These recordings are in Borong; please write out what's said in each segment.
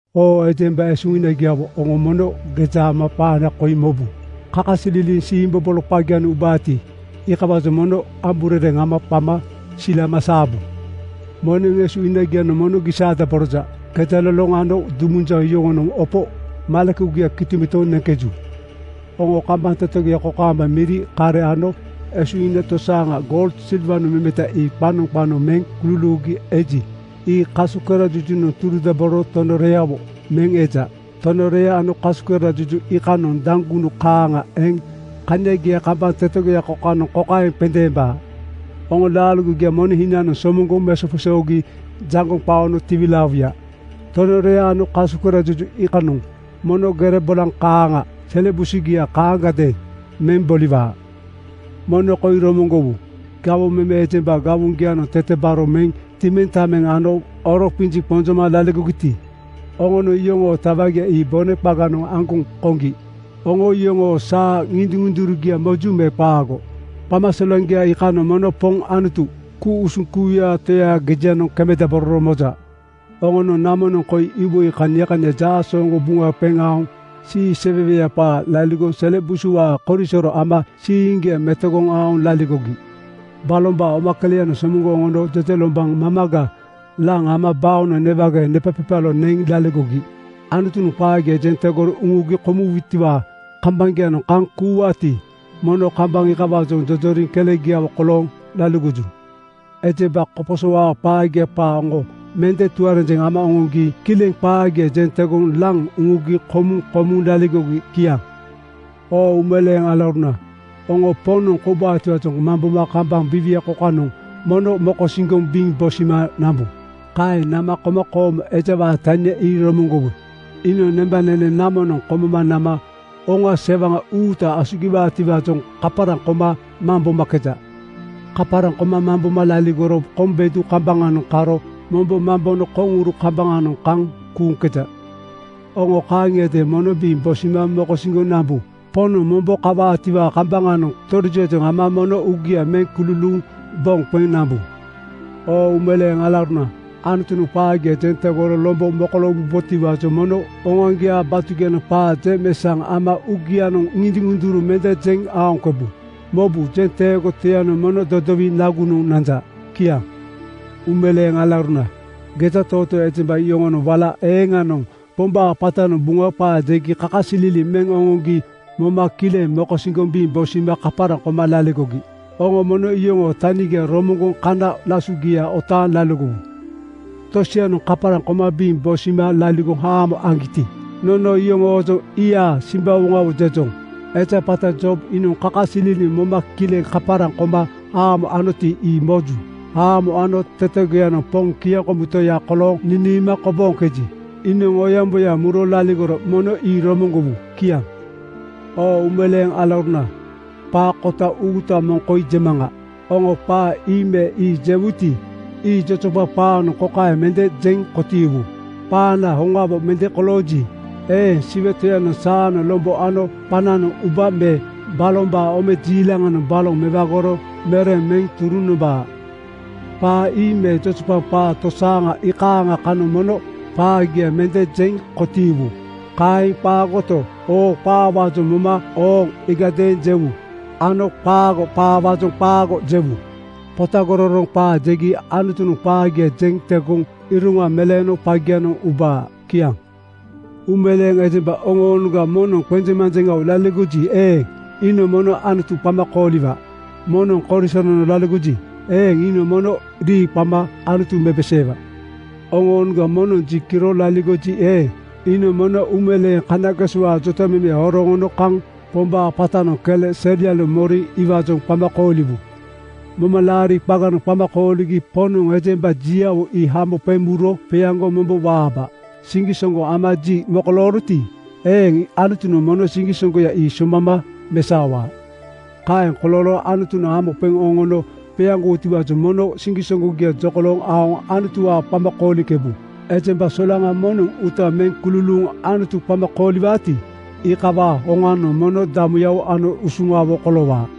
Oo ejemba esuhinagiawo, oŋo mono geja ama qaana koi mobu: Kakasililiŋ siimbobolo qagianoŋ ubaati, iikawaajoŋ mono amburereŋ ama qama silama saabu. Moneŋ esuhinagianoŋ mono gisaadaboroja. Gejaloloŋ ano dumunjaŋ yoŋonoŋ opo malekugia kitomitoŋ neŋkeju. Oŋo kambaŋ tetegoya kokaamba miri, kare ano esuhina tosaaŋa goul, silwanoŋ memeta ii qanoŋ qanoŋ meŋ kululuugi eji, ii kasukerajujunoŋ turudabororo tonoreawo (rost) meŋ eja. Tonorea ano kasukerajuju iikanoŋ daŋgunu kaaŋa eŋ kaniagia kambaŋ tetegoya kokanoŋ kokaeŋ qendeembaa: Oŋo laaligogia moneŋ hinanoŋ somoŋgoŋ mesoqesoogi jaŋgoŋ qaono tiwilaawuya. Tonorea ano kasukerajuju iikanoŋ mono gere bolaŋ kaaŋa sele busugia kaaŋagadeeŋ meŋ boliwaa. Mono koi romoŋgowu: Gawoŋ meme ejemba gawoŋgianoŋ tetebaro meŋ timiŋtameŋ ano oro qinjiŋ qonjoma laligogiti, oŋonoŋ iyoŋoo tawagia ii bone qaganoŋ aŋgoŋ koŋgi. Oŋo iyoŋoo saa ŋindiŋ-ŋundurugia moju me qaago? Qamasilaŋgia iikanoŋ mono Poŋ Anutu, ku-usuŋ kuuyaa Toyaa gejianoŋ kemedabororo moja. Oŋonoŋ namonoŋ koi iwoi kania kania jaasooŋgo buŋa qeŋ aoŋ siiseweweya qaa laligoŋ sele busuwaa korisoro ama siiŋgia metogoŋ aoŋ laligogi. Balombaa omakeleyanoŋ somoŋgoŋ oŋono jejelombaŋ mamaga laŋ ama baonoŋ newageeŋ nepaqepalo neŋ laligogi. Anutunoŋ qaagia jeŋ tegoro uŋugi komuwutiwaa kambaŋgianoŋ kaŋ kuuwaati, mono kambaŋ iikawaajoŋ jojoriŋ kelegiawo kolooŋ laligoju. Ejemba koposowaa qaagia qaa oŋo mende tuarenjeŋ ama oŋoŋgi kileŋ qaagia jeŋ tegoŋ laŋ uŋugi komuŋ komuŋ laligogi. Kiaŋ. Oo uumeleeŋ alauruna, oŋo Poŋnoŋ koubaatiwaajoŋ mamboma kambaŋ biiwia kokanoŋ mono mokosiŋgoŋ biŋ bosima nambu. Kaeŋ nama komakoomo ejawaa tania ii romoŋgowu: Iinoŋ nembanene namonoŋ komoma nama hoŋa sewaŋa uuta asugiwaatiwaajoŋ kaparaŋ koma mambomakeja. Kaparaŋ koma mamboma laligoro koŋ bedu kambaŋanoŋ karo mombo mambono koŋuru kambaŋanoŋ kaŋ kuuŋkeja. Oŋo kaaŋiadeeŋ mono biŋ bosima mokosiŋgoŋ nambu. Poŋnoŋ mombo kawaatiwaa kambaŋanoŋ torijiwaajoŋ ama mono uugia meŋ kululuuŋ boŋ qeŋ nambu. Oo uumeleeŋ alauruna, Anutunoŋ qaagia jeŋ tegoro lombo mokoloowubotiwaajoŋ mono oŋoaŋgiaa batugianoŋ qaa jeŋmeesaŋ ama uugianoŋ ŋindiŋ-ŋunduru mende jeŋ aoŋkebu. Mobu, jenteego Toyanoŋ mono dodowiŋ nagunoŋ nanja. Kiaŋ. Uumeleeŋ alauruna, gejatootoo ejemba yoŋonoŋ wala eeŋanoŋ Pombaa qatanoŋ Buŋa qaa jegi kakasililiŋ meŋ oŋoŋgi moma kileŋ mokosiŋgoŋ biŋ bosima kaparaŋ koma laligogi. Oŋo mono iyoŋoo tanigia romoŋgoŋ kana lasugia otaaŋ laligowu. Tosianoŋ kaparaŋ koma biŋ bosima laligoŋ haamo aŋgiti, nono iyoŋoojoŋ “Ii-a simbawoŋawo!” jejoŋ. Eja qata Job iinoŋ kakasililiŋ moma kileŋ kaparaŋ koma haamo anoti, ii moju. Haamo ano tetegoyanoŋ Poŋ kiaŋkomu Toya kolooŋ niniima kobooŋkeji, iinoŋ oyaŋboyaŋa muro laligoro. Mono ii romoŋgowu. Kiaŋ. Oo uumeleeŋ alauruna! Qaa kota uuta moŋ koi jemaŋa. Oŋo qaa ii me ii jewuti, ii jojopaŋ qaanoŋ kokaeŋ mende jeŋ kotiiwu, “Qaana hoŋawo mende kolooji eeŋ, Siwe Toyanoŋ saanoŋ lombo ano qananoŋ ubaa me balombaa omejiilaŋanoŋ baloŋ mewagoro mereŋ meŋ turuŋ nomba.” Qaa ii me jojopaŋ qaa tosaaŋa iikaaŋa kanoŋ mono qaagia mende jeŋ kotiiwu. Kaeŋ qaagoto, oo-qaawaajoŋ moma “Ooŋ!” iigadeeŋ jewu ano qaago-qaawaajoŋ “Qaago!” jewu. Potagororoŋ qaa jegi Anutunoŋ qaagia jeŋ tegoŋ iroŋa meleeno qagianoŋ ubaa. Kiaŋ. Uumeleeŋ ejemba oŋoonoŋga moŋnoŋ qenjeŋmanjeŋawo laligoji eeŋ, iinoŋ mono Anutu qama kooliwa. Moŋnoŋ korisoronoŋ laligoji eeŋ, iinoŋ mono rii qama Anutu mepeseewa. Oŋoonoŋga moŋnoŋ ji kiro laligoji eeŋ, iinoŋ mono uumeleeŋ kanagesowaa jotamemeya horoŋ oŋono kaŋ Pombaa qatanoŋ kele selianoŋ moriŋ iwaajoŋ qama kooliwu. Momalaari qaganoŋ qama kooligi Poŋnoŋ ejemba jiawo ii hamo qeŋ muro qeaŋgoŋ mombo waabaa. Siŋgisoŋgo ama ji mokolooroti eeŋ, Anutunoŋ mono siŋgisoŋgoya ii soŋgbama mesaowaa. Kaeŋ kolooro Anutunoŋ hamo qeŋ oŋono qeaŋgowutiwaajoŋ mono siŋgisoŋgogia jokolooŋ aoŋ Anutuwaa qama kooliŋkebu. Ejemba solaŋa moŋnoŋ uuta meŋ kululuuŋ Anutu qama kooliwaati, iikawaa hoŋanoŋ mono damuyawo ano usuŋawo koloowaa.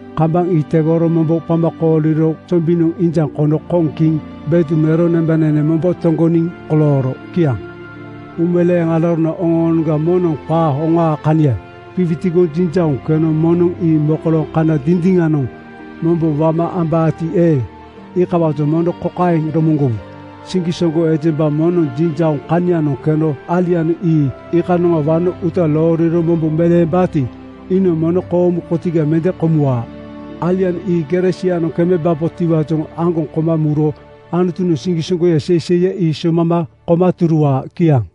Kambaŋ ii tegoro mombo qama kooliro sombiŋ injaŋ kono koŋ kiŋ bedu mero nembanene mombo toŋgoniŋ kolooro. Kiaŋ. Uumeleeŋ alauruna, oŋoonoŋga moŋnoŋ qaa hoŋaa kania qiwitigoŋ jinjauŋ keno moŋnoŋ ii mokolooŋ kana dindiŋanoŋ mombo wama ambaati eeŋ, iikawaajoŋ mono kokaeŋ romoŋgowu: Siŋgisoŋgo ejemba moŋnoŋ jinjauŋ kanianoŋ keno alianoŋ ii iikanoŋa wano uuta looriro mombo meleembaati, iinoŋ mono koomu kotiga mende komuwaa. Alianoŋ ii gere sianoŋ kemebabotiwaajoŋ aŋgoŋ koma muro Anutunoŋ siŋgisoŋgoya seiseiya ii soŋgbama koma turuwaa. Kiaŋ.